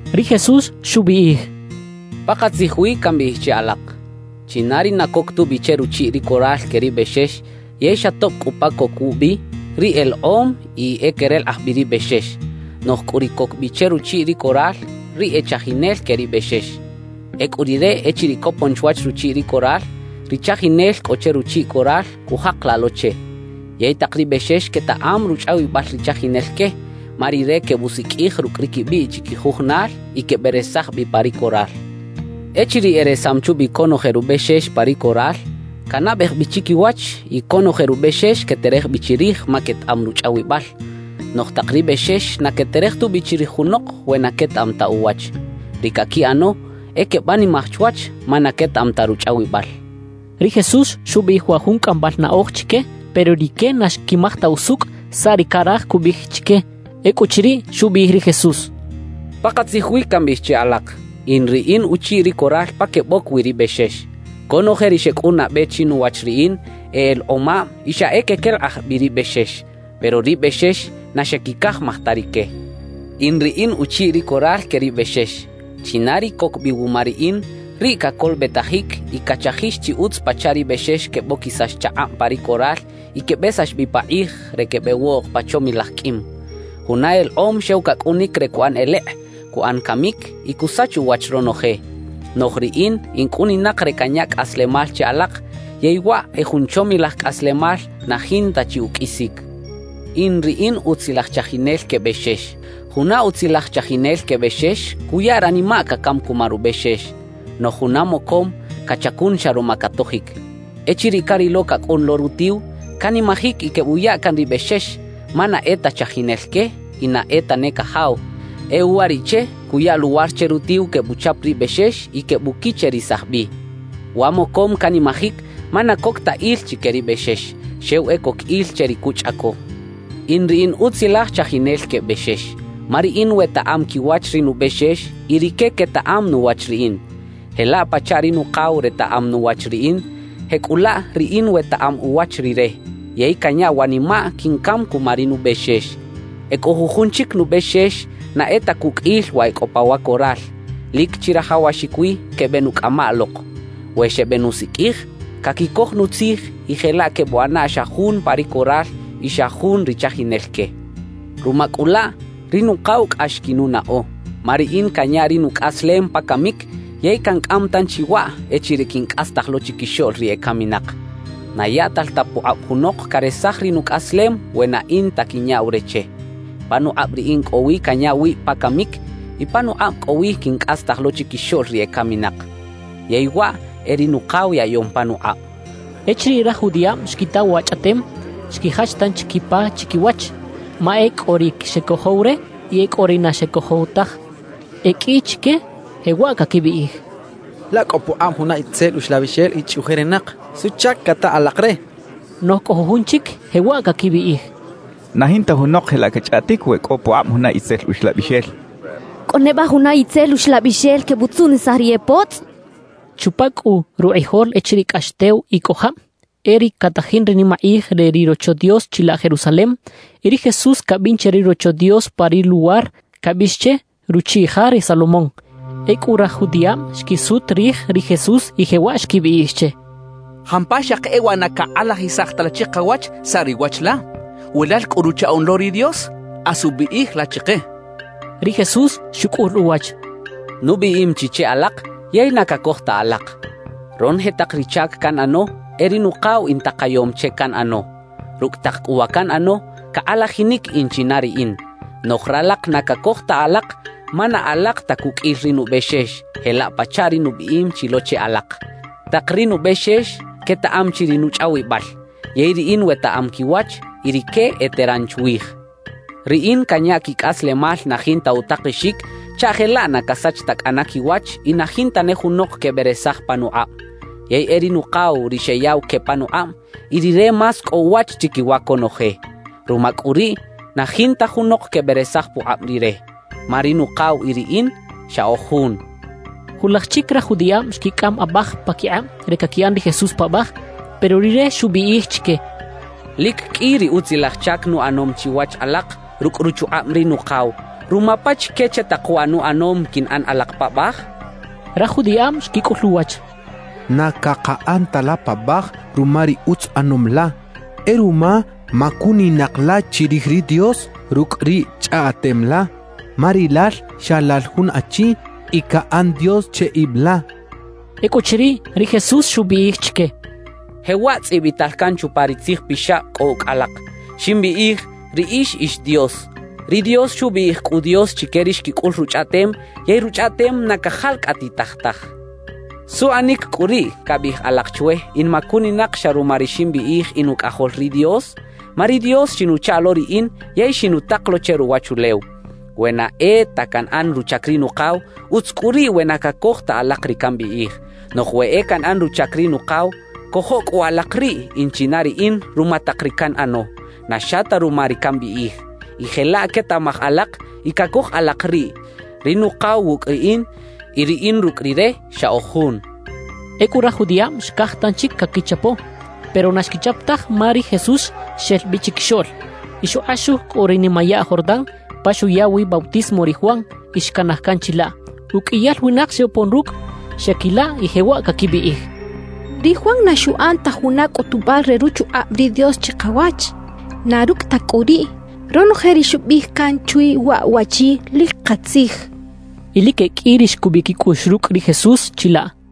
Ri Jesús xubiꞌij: «Pakatzij wi cambiꞌij che alak: China ri na coc tubi che ruchiꞌ ri coral que ri bexex yey xa tob cꞌu pa coc wubi, riꞌ elekꞌom y e querelekꞌaj bi ri bexex. Noꞌj cꞌu ri coc bi che ruchiꞌ ri coral, riꞌ e chajinel que ri bexex. Ecꞌu rire echiriꞌ copon chwach ruchiꞌ ri coral, ri chajinel cꞌo che ruchiꞌ coral, cujakalaꞌ lo che. Yey tak ri bexex quetaꞌam ruchꞌawibal ri chajinel que, ma rire quebusiqꞌuij rucꞌ ri quibiꞌ chiquijujunal y queberesaj bi pa ri coral. Echiriꞌ eresam chubi conoje rubexex pa ri coral, canabej bi chiquiwach y conoje rubexex queterej bi chirij ma quetaꞌam ruchꞌawibal. Noꞌj tak ri bexex na queterej tubi chirij junok we na quetaꞌam ta uwach; ri caquiꞌano e quebanimaj chwach ma na quetaꞌam ta ruchꞌawibal» xchaꞌ. Ri Jesús xubiꞌij wa jun cꞌambal naꞌoj chique, pero rique na xquimaj ta usucꞌ saꞌ ri caraj cubiꞌij chique. Ecꞌuchiriꞌ, xubiꞌij ri Jesús: «Pakatzij wi cambiꞌij che alak: In ri in uchiꞌ ri coral pa queboc wi ri bexex. Conoje ri xecꞌun nabe chinuwach riꞌin e elekꞌomab y xa e quequelekꞌaj bi ri bexex; pero ri bexex na xequicajmaj ta rique. »In ri in uchiꞌ ri coral que ri bexex. China ri coc bi wuma riꞌin, riꞌ cacolobetajic y cachajix chi utz pachaꞌ ri bexex queboquisax chakꞌab pa ri coral y quebesax bi pakꞌij re quebeꞌwoꞌk pa chomilaj qꞌuim. Juna elekꞌom xew cacꞌunic re cuꞌan elekꞌ, cuꞌan camic y cusach uwach ronoje. Noꞌj riꞌin in cꞌuninak re canya cꞌaslemal che alak yey waꞌ e jun chomilaj cꞌaslemal na jinta chi uqꞌuisic. »In ri in utzilaj chajinel que bexex. Juna utzilaj chajinel que bexex cuya ranimaꞌ cacam cuma rubexex. Noꞌj juna mocom cachacun xa ruma catojic. Echiriꞌ carilo cacꞌun lo rutiw, canimajic y quebuya can ri bexex; ma na e ta chajinel que y na e tane cajaw. E uwariꞌche cuya luwar che rutiw quebuchap ri bexex y quebuquicherisaj bi. Wa mocom canimajic ma na coc ta il chique ri bexex, xew e coc il che ri cuchꞌaco. »In ri in utzilaj chajinel que bexex, ma riꞌin wetaꞌam quiwach ri nubexex y rique quetaꞌam nuwach riꞌin. Jelaꞌ pachaꞌ ri Nukaw retaꞌam nuwach riꞌin, jecꞌulaꞌ riꞌin wetaꞌam uwach Rire; yey canya wanimaꞌ quincam cuma ri nubexex. »E cꞌo jujun chic nubexex na e ta cuqꞌuil wa e cꞌo pa wa coral. Lic chirajawaxic wi quebeꞌnucꞌamaꞌ lok. We xebenusiqꞌuij, caquicoj nutzij y jelaꞌ quebuꞌana xa jun pa ri coral y xa jun ri chajinel que. »Ruma cꞌu laꞌ, ri Nukaw cꞌax quinunaꞌo, ma riꞌin canya ri nucꞌaslem pa camic yey cancꞌam tanchi waꞌ echiriꞌ quincꞌastaj lo chiquixoꞌl ri ecaminak. Na yaꞌtal ta pukꞌab junok caresaj ri nucꞌaslem we na in ta quinyaꞌw re che. Panukꞌab riꞌin cꞌo wi canya wib pa camic y panukꞌab cꞌo wi quincꞌastaj lo chiquixoꞌl ri ecaminak. Yey waꞌ e ri Nukaw yaꞌyom panukꞌab» xchaꞌ. Echiriꞌ raj judiꞌab xquita wa chꞌaꞌtem, xquijach tanchi quipa chiquiwach, ma e cꞌo ri xecojow re y e cꞌo ri na xecojow taj. E qꞌui chique jewaꞌ caquibiꞌij: «Laꞌ cꞌo pukꞌab juna itzel uxlabixel y chꞌuꞌjerinak. ¿Suꞌchac cata alak re?» quechaꞌ. Noꞌj cꞌo jujun chic jewaꞌ caquibiꞌij: «Na jinta junok jelaꞌ cachꞌaꞌtic we cꞌo pukꞌab juna itzel uxlabixel. ¿Cꞌo neba juna itzel uxlabixel quebutzuꞌnisaj ri e potzꞌ?» quechaꞌ. Chupa cꞌu rukꞌijol echiriꞌ cꞌax tew y cꞌo jab, e riꞌ catajin ri nimakꞌij re ri Rocho Dios chilaꞌ Jerusalem. Y ri Jesús cabin che ri Rocho Dios pa ri luwar cabiꞌx che “Ruchiꞌ Ja re Salomón” Ecꞌu raj judiꞌab xquisut rij ri Jesús y jewaꞌ xquibiꞌij che: —¿Jampa xaki e waꞌ na cakꞌalajisaj ta la chikawach saꞌ ri wach la? We lal cꞌu Ruchaꞌoꞌn lo ri Dios, asu biꞌij la chike —xechaꞌ. Ri Jesús xucꞌul uwach: —Nubiꞌim chi che alak, yey na cacoj ta alak. Ronoje tak ri chac canꞌano, e ri Nukaw intakayom che canꞌano. Rucꞌ tak cꞌu wa canꞌano, cakꞌalajinic in china riꞌin. Noꞌj ralak na cacoj ta alak, ma na alak ta cuqꞌuil ri nubexex, jelaꞌ pachaꞌ ri nubiꞌim chi lo che alak. Tak ri nubexex quetaꞌam chi ri nuchꞌawibal; yey riꞌin wetaꞌam quiwach y rique eteran chwij. Riꞌin canya quicꞌaslemal na jinta utakexic chaꞌ jelaꞌ na casach ta cꞌana quiwach y na jinta ne junok queberesaj panukꞌab. Yey e ri Nukaw ri xeyaꞌw que panukꞌab, y Rire más cꞌo uwach chiquiwa conoje. Ruma cꞌu riꞌ, na jinta junok queberesaj pukꞌab Rire. Ma ri Nukaw y riꞌin xa oj jun —xchaꞌ. Julaj chic raj judiꞌab xquicꞌam abaj paquikꞌab re caquiꞌan ri Jesús paꞌbaj. Pero Rire xubiꞌij chique: —Lic qꞌui ri utzilaj chac nuꞌanom chiwach alak rucꞌ ruchukꞌab ri Nukaw. ¿Ruma pachique che tak wa nuꞌanom quinꞌan alak paꞌbaj? —xchaꞌ. Raj judiꞌab xquicꞌul uwach: —Na cakaꞌan ta la paꞌbaj ruma ri utz ꞌanom la; e ruma macuninak la chirij ri Dios rucꞌ ri chꞌaꞌtem la. Ma rilal xa lal jun achi y caꞌan Dios che ib la —xechaꞌ. Ecꞌuchiriꞌ, ri Jesús xubiꞌij chique: —Jewaꞌ tzꞌibital can chupa ri Tzij Pixab cꞌo ucꞌ alak: “Ximbiꞌij: Riꞌix ix dios.” Ri Dios xubiꞌij cꞌu “dios” chique ri xquicꞌul Ruchꞌaꞌtem, yey Ruchꞌaꞌtem na cajalcꞌatitaj taj. ¿Suꞌanic cꞌu riꞌ cabiꞌij alak chwe in macuninak xa ruma ri ximbiꞌij in Ucꞌajol ri Dios? ma ri Dios xinuchaꞌ lo riꞌin yey xinutak lo che ruwachulew. »We na e ta canꞌan ruchac ri Nukaw, utz cꞌu riꞌ we na cacoj ta alak ri cambiꞌij. Noꞌj we e canꞌan ruchac ri Nukaw, cojo cꞌu alak riꞌ in china riꞌin ruma tak ri canꞌano, na xa ta ruma ri cambiꞌij. Y jelaꞌ quetaꞌmaj alak y cacoj alak riꞌ: Ri Nukaw wucꞌ riꞌin y riꞌin rucꞌ Rire, xa oj jun —xchaꞌ. Ecꞌu raj judiꞌab xcaj tanchic caquichapo, pero na xquichap taj ma ri Jesús xel bi chiquixoꞌl. Y xukꞌaxuj cꞌu ri nimayaꞌ Jordán pa xuya wi bautismo ri Juan y xcanaj can chilaꞌ. Uqꞌuiyal winak xebopon rucꞌ; xeꞌquilaꞌ y jewaꞌ caquibiꞌij: «Ri Juan na xuꞌan ta juna cꞌutubal re ruchukꞌab ri Dios chikawach; na rucꞌ ta cꞌu riꞌ, ronoje ri xubiꞌij can chwi waꞌ waꞌchi, lic katzij» quechaꞌ. Y lic e qꞌui ri xcubiꞌ quicꞌuꞌx rucꞌ ri Jesús chilaꞌ.